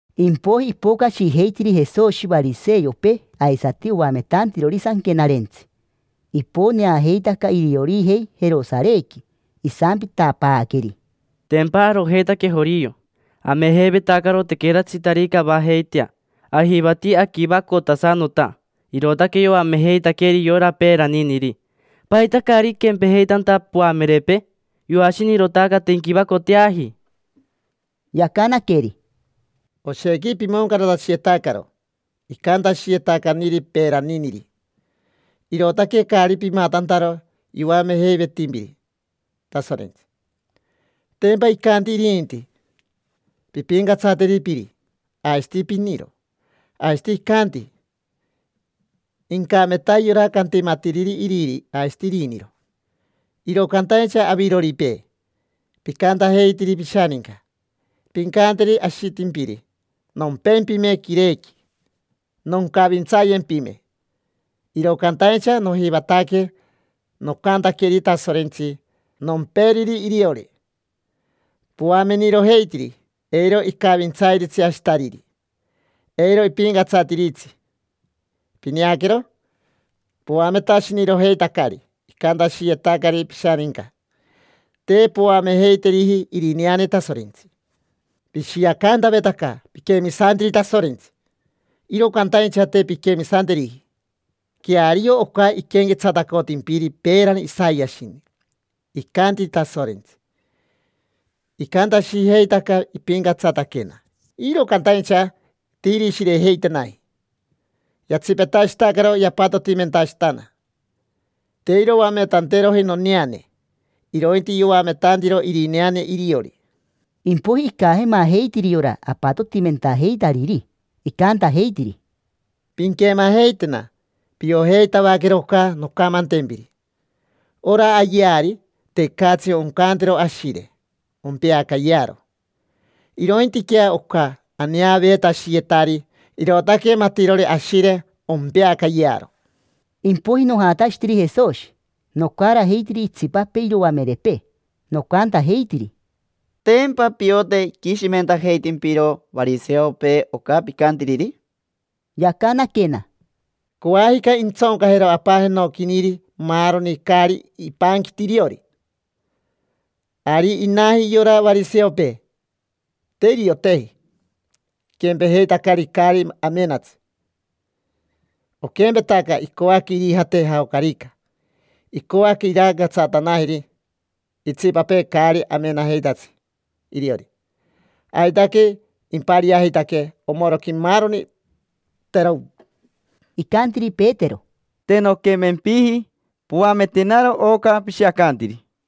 Impoiji ipocashijeitiri Jesoshi variseopee aisati oametantirori Sanquenarentsi. Iponeajeitaca iriorijei Jerosarequi. Isampitapaaqueri: —Tempa arojeitaque jorio. Amejeivetacaro tequeratsitarica avajeitea, ajivati aquivacotasanota. Irootaque yoamejeitaqueeri yora peeraniniri. ¿Paita caari iquempejeitanta poamerepee? Yoashinirotaca, te inquivacoteaji. Yacanaqueri: —Oshequi pimoncaratashiyetacaro icantashiyetacaniri peeraniniri, irootaque caari pimatantaro yoamejeivetimpiri Tasorentsi. Tempa icanti irinti: “Pimpincatsateri piri aisati piniro”. Aisati icanti: “Incameta yora cantimatiriri iriri aisati iriniro”. Iro cantaincha aviroripee, picantajeitiri pishaninca: “Pincanteri ashitimpiri ‘Nompempime quirequi, noncavintsayempime, iro cantaincha nojivataque nocantaqueri Tasorentsi nomperiri iriori’”. Poamenirojeitiri eiro icavintsairitsi ashitariri, eiro ipincatsatiritsi. Pineaquero, poametashinirojeitacari icantashiyetacari pishaninca, te poamejeiteriji irineane Tasorentsi. Pishiacantavetaca piquemisantiri Tasorentsi, iro cantaincha te pinquemisanteriji. Queario oca iquenquetsatacotimpiri peerani Isayashini: “Icanti Tasorentsi: ‘Icantashijeitaca ipincatsataquena, iro cantaincha te irishirejeitenaji. Yatsipetashitacaro yapatotimentashitana, te iroametanteroji noneane, irointi yoametantiro irineane iriori’”. Impoiji icajemajeitiri yora apatotimentajeitariri, icantajeitiri: —Pinquemajeitena, piojeitavaquero oca noncamantempiri: ora ayeari, tecatsi oncantero ashire ompeacayearo. Irointiquea oca aneaveetashiyetari, irootaque matirori ashire ompeacayearo. Impoiji nojatashitiri Jesoshi, nocarajeitiri itsipapee iroamerepee, nocantajeitiri: —¿Tempa piote iquishimentajeitimpiro variseopee oca picantiriri? Yacanaquena: —Coajica intsocajero Apa jenoquiniri maaroni caari ipanquiti iriori. Ari inaji yora variseopee: te irioteji, iquempejeitacari caari amenatsi. Oquempetaca icoaque irijate jaocarica, icoaque irancatsatanajeri itsipapee caari amenajeitatsi iriori. Aitaque impariajeitaque omoroqui maaroni, terocn. Icantiri Petero: —Te nonquemempiji, poametenaro oca pishiacantiri.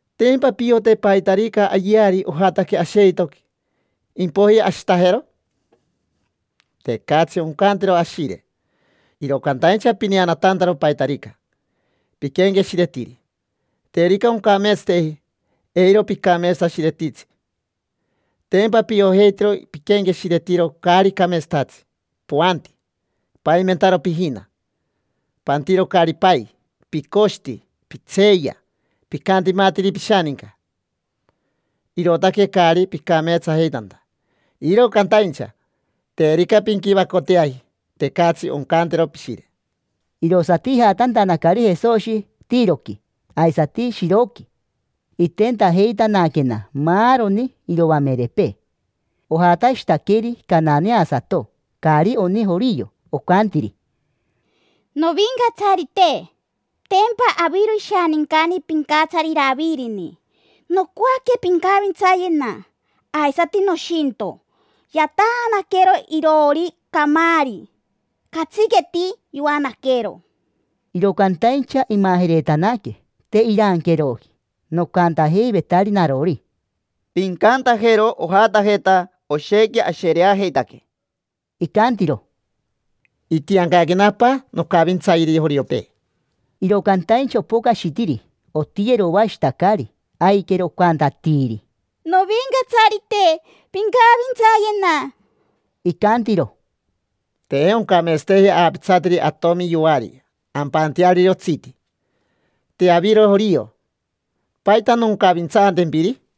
¿Tempa piote paitarica ayeari ojataque asheitoqui, impoiji ashitajero? Tecatsi oncantero ashire. Iro cantaincha pineanatantaro paitarica piquenqueshiretiri: terica oncameetsateji, eiro picameetsashiretitsi. Tempa piojeitiro piquenqueshiretiro caari cameetsatatsi, poanti, paimentaro pijina, pantiro caari pai, picoshiti, pitseeya, picantimatiri pishaninca. Irootaque caari picameetsajeitanta. Iro cantaincha terica pinquivacoteaji, tecatsi oncantero pishire. Irosati ijatantanacari Jesoshi Tiroqui aisati Shiroqui. Itentajeitanaquena maaroni iroamerepee. Ojatashitaqueri cananasato, caari oni jorio. Ocantiri: —Novincatsarite, tempa aviro ishanincani pincatsari Iravirini. Nocoaque pincavintsayena, aisati noshinto. Yataanaquero iroori camaari, catsiqueti yoanaquero. Iro cantaincha imajeretanaque, te iranqueroji. Nocantajeivetari narori: —Pincantajero ojatajeta, oshequi ashereajeitaquee. Icantiro: —Itiancaquena Apa noncavintsayeri joriopee. Iro cantaincha opocashitiri, otiyeroashitacari, aiquero ocantatiiri: —Novincatsarite, pincavintsayena. Icantiro: —Te oncameetsateji aapitsateri atomi yoari ampanteariri otsiti. Te aviro jorio, ¿paita noncavintsaantempiri?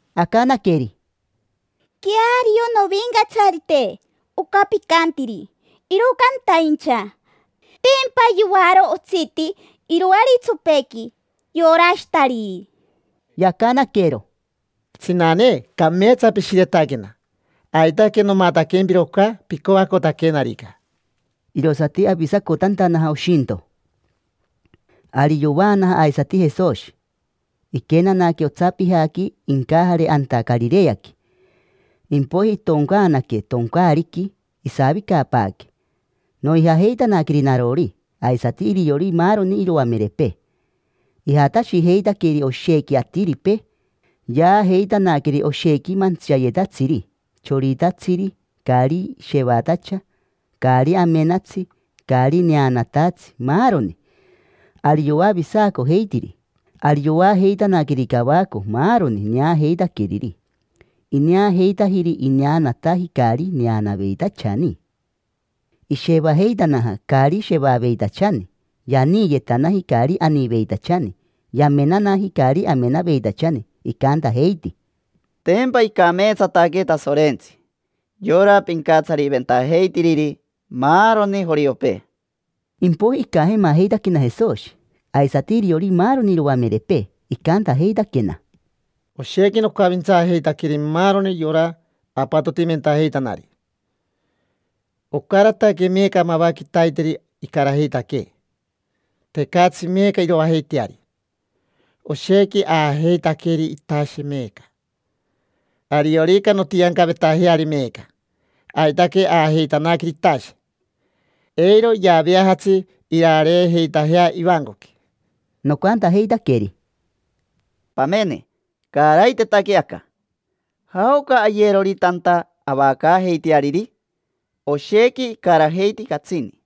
Acanaqueri: —Queario, novincatsarite, oca picantiri. Iro cantaincha, tempa yoaro otsiti iroaritsopequi yora ashitariri. Yacanaquero: —Tsinane, cameetsa pishiretaquena. Aitaque nomataquempiro oca picoacotaquenarica. Irosati avisacotantanaja oshinto. Ari yovaanaja aisati Jesoshi, iquenanaque otsapijaqui incajare anta Carireaqui. Impoiji itoncaanaque toncaariqui, isavicapaaque. Noijajeitanaqueri narori, aisati iriori maaroni iroamerepee. Ijatashijeitaqueri oshequi atiripee, yaajeitanaqueneri oshequi mantsiayetatsiri: choritatsiri, caari shevatacha, caari amenatsi, caari neanatatsi, maaroni. Ari yoavisacojeitiri. Ari yoajeitanaqueri cavaco maaroni neajeitaqueriri. Ineajeitajiri ineanataji caari neanaveitachani, ishevajeitanaja caari shevaveitachani, yaniiyetanaji caari aniiveitachani, yamenanaji caari amenaveitachani. Icantajeiti: —Tempa icameetsataque Tasorentsi, yora pincatsariventajeitiriri maaroni joriopee. Impoiji icajemajeitaquena Jesoshi, aisati iriori maaroni iroamerepee. Icantajeitaquena: —Oshequi nocavintsaajeitaqueri maaroni yora apatotimentajeitanari. Ocarataque meeca mava quitaiteri icarajeitaquee: tecatsi meeca iroajeiteari. Oshequi aajeitaqueri itashe meeca. Ariorica nontiancavetajeari meeca, aitaque ajaajeitanaqueri itashe, eiro yaaveajatsi irareejeitajea ivancoqui. Nocantajeitaqueri: —Pamene, caaraiteitaque aca. ¿Jaoca ayerori tanta avacaajeiteariri? Oshequi icarajeiti catsini.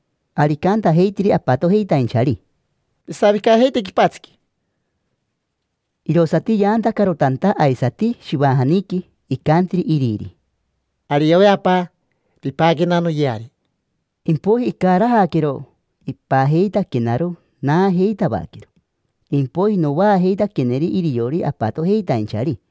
Ari icantajeitiri apatojeitainchari: —Pisavicajeite quipatsiqui. Irosati yaantacaro tanta aisati shivajaniqui. Icantiri iriri: —Ariove apa, pipaquena noyeari. Impoiji icarajaquero, ipajeitaquenaro. Naajeitavaquero, impoiji novaajeitaqueneri iriori apatojeitainchari.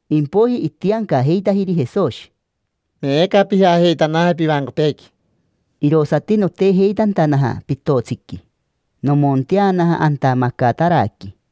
Impoiji itiancajeitajiri Jesoshi: —Meeca pijajeitanaje pivancopeequi. Irosati notejeitantanaja pitotsiqui, nomonteanaja anta Macataraqui.